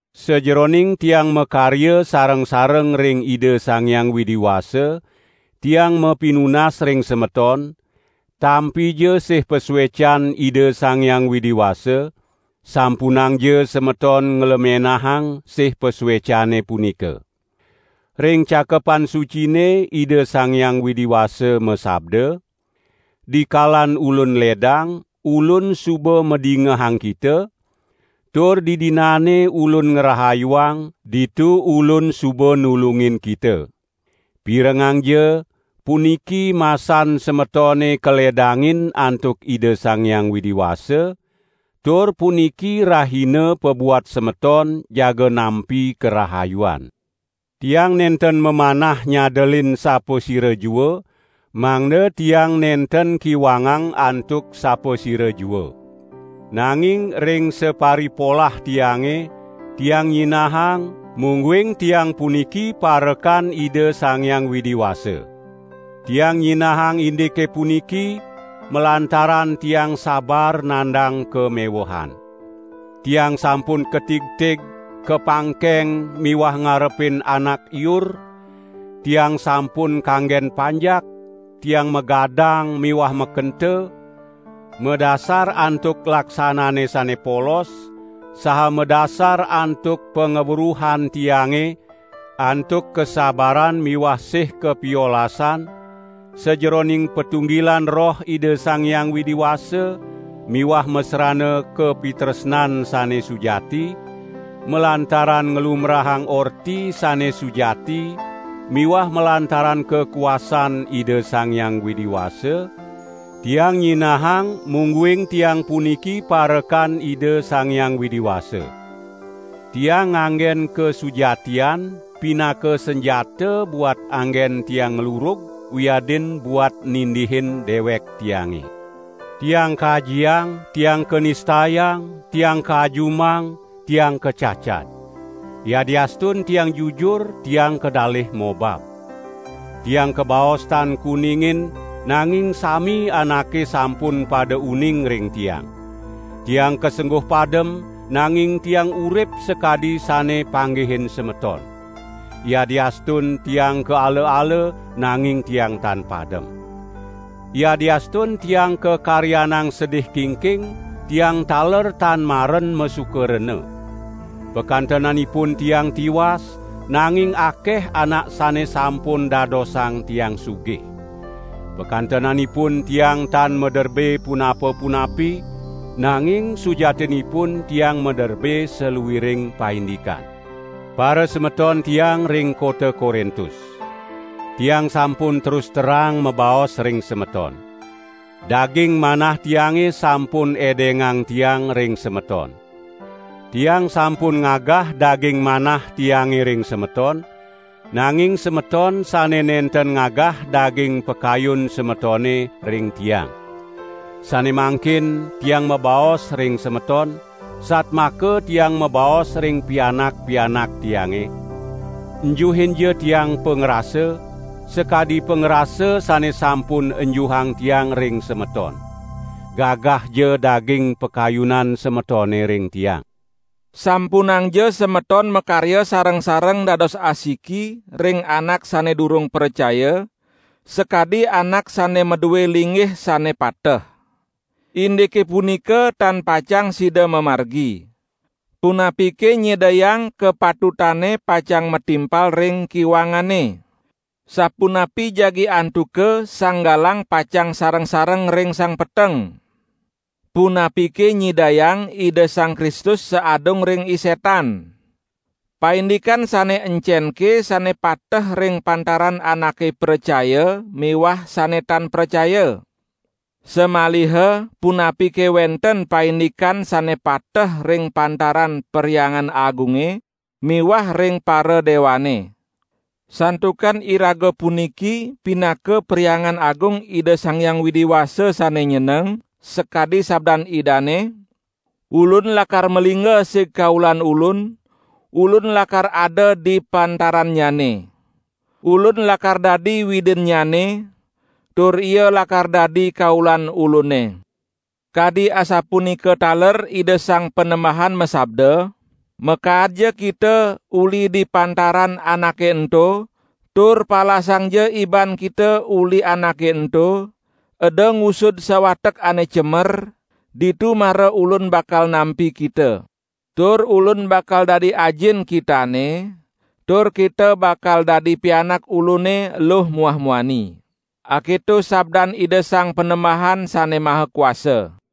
Sajeroning tiang makarya sareng-sareng ring Ida Sang Hyang Widi Wasa, tiang mapinunas ring semeton; tampija sih pasuecan Ida Sang Hyang Widi Wasa; sampunangja semeton nglemenahang sih pasuecane punika. Ring Cakepan Sucine Ida Sang Hyang Widi Wasa masabda: "Dikalan Ulun ledang, Ulun suba madingehang kita, tur didinane Ulun ngrahayuang, ditu Ulun suba nulungin kita." Pirengangja, puniki masan semetone kaledangin antuk Ida Sang Hyang Widi Wasa, tur puniki rahina pabuat semeton jaga nampi karahayuan. Tiang nenten mamanah nyadelin sapasira jua, mangda tiang nenten kiwangang antuk sapasira jua. Nanging ring saparipolah tiange, tiang nyinahang, mungguing tiang puniki parekan Ida Sang Hyang Widi Wasa. Tiang nyinahang indike puniki, malantaran tiang sabar nandang kamewehan. Tiang sampun katigtig, kapangkeng miwah ngarepin anak iur, tiang sampun kanggen panjak, tiang magadang miwah makenta; madasar antuk laksanane sane polos, saha madasar antuk pangweruhan tiange, antuk kasabaran miwah sih kapiolasan, sajeroning patunggilan Roh Ida Sang Hyang Widi Wasa miwah masrana kapitresnan sane sujati, malantaran nglumbrahang orti sane sujati miwah malantaran kakuasan Ida Sang Hyang Widi Wasa, tiang nyinahang mungguing tiang puniki parekan Ida Sang Hyang Widi Wasa. Tiang nganggen kasujatian pinaka sanjata buat anggen tiang nglurug wiadin buat nindihin dewek tiange. Tiang kajiang, tiang kanistayang; tiang kaajumang, tiang kacacad. Yadiastun tiang jujur tiang kadalih mobab. Tiang kabaos tan kuningin, nanging sami anake sampun pada uning ring tiang. Tiang kasengguh padem, nanging tiang urip sakadi sane panggihin semeton. Yadiastun tiang kaala-ala, nanging tiang tan padem. Yadiastun tiang kakaryanang sedih kingking, tiang taler tan maren masuka rena. Pakantenanipun tiang tiwas, nanging akeh anak sane sampun dadosang tiang sugih. Pakantenanipun tiang tan maderbe punapa-punapi, nanging sujatinipun tiang maderbe saluiring paindikan. Parasemeton tiang ring kota Korintus. Tiang sampun terus terang mabaos ring semeton. Daging manah tiange sampun edengang tiang ring semeton. Tiang sampun ngagah daging manah tiange ring semeton, nanging semeton sane nenten ngagah daging pakayun semetone ring tiang. Sane mangkin tiang mabaos ring semeton, satmaka tiang mabaos ring pianak-pianak tiange: Enjuhinja tiang pangrasa, sakadi pangrasa sane sampun enjuhang tiang ring semeton. Gagahja daging pakayunan semetone ring tiang. Sampunangja semeton makarya sareng-sareng dados asiki ring anak sane durung pracaya, sakadi anak sane madue linggih sane pateh. Indike punika tan pacang sida mamargi. Punapike nyidayang kapatutane pacang matimpal ring kiwangane? Sapunapi jagi antuka sang galang pacang sareng-sareng ring sang peteng? Punapike nyidayang Ida Sang Kristus saadung ring I Setan? Paindikan sane encenke sane pateh ring pantaran anake pracaya miwah sane tan pracaya? Samaliha punapike wenten paindikan sane pateh ring pantaran Perhyangan Agunge miwah ring paradewane? Santukan iraga puniki pinaka Perhyangan Agung Ida Sang Hyang Widi Wasa, sane nyeneng, sakadi sabdan Idane: "Ulun lakar malingga sig kaulan Ulun, Ulun lakar ada di pantarannyane. Ulun lakar dadi Widinnyane tur ia lakar dadi kaulan Ulune." Kadi asapunika taler Ida Sang Panembahan masabda: "Makaadja kita uli di pantaran anake ento, tur palasangja iban kita uli anake ento, eda ngusud sawatek ane cemer, ditu mara Ulun bakal nampi kita. Tur Ulun bakal dadi Ajin kitane, tur kita bakal dadi pianak Ulune eluh muah muani. Aketo sabdan Ida Sang Panembahan Sane Maha Kuasa."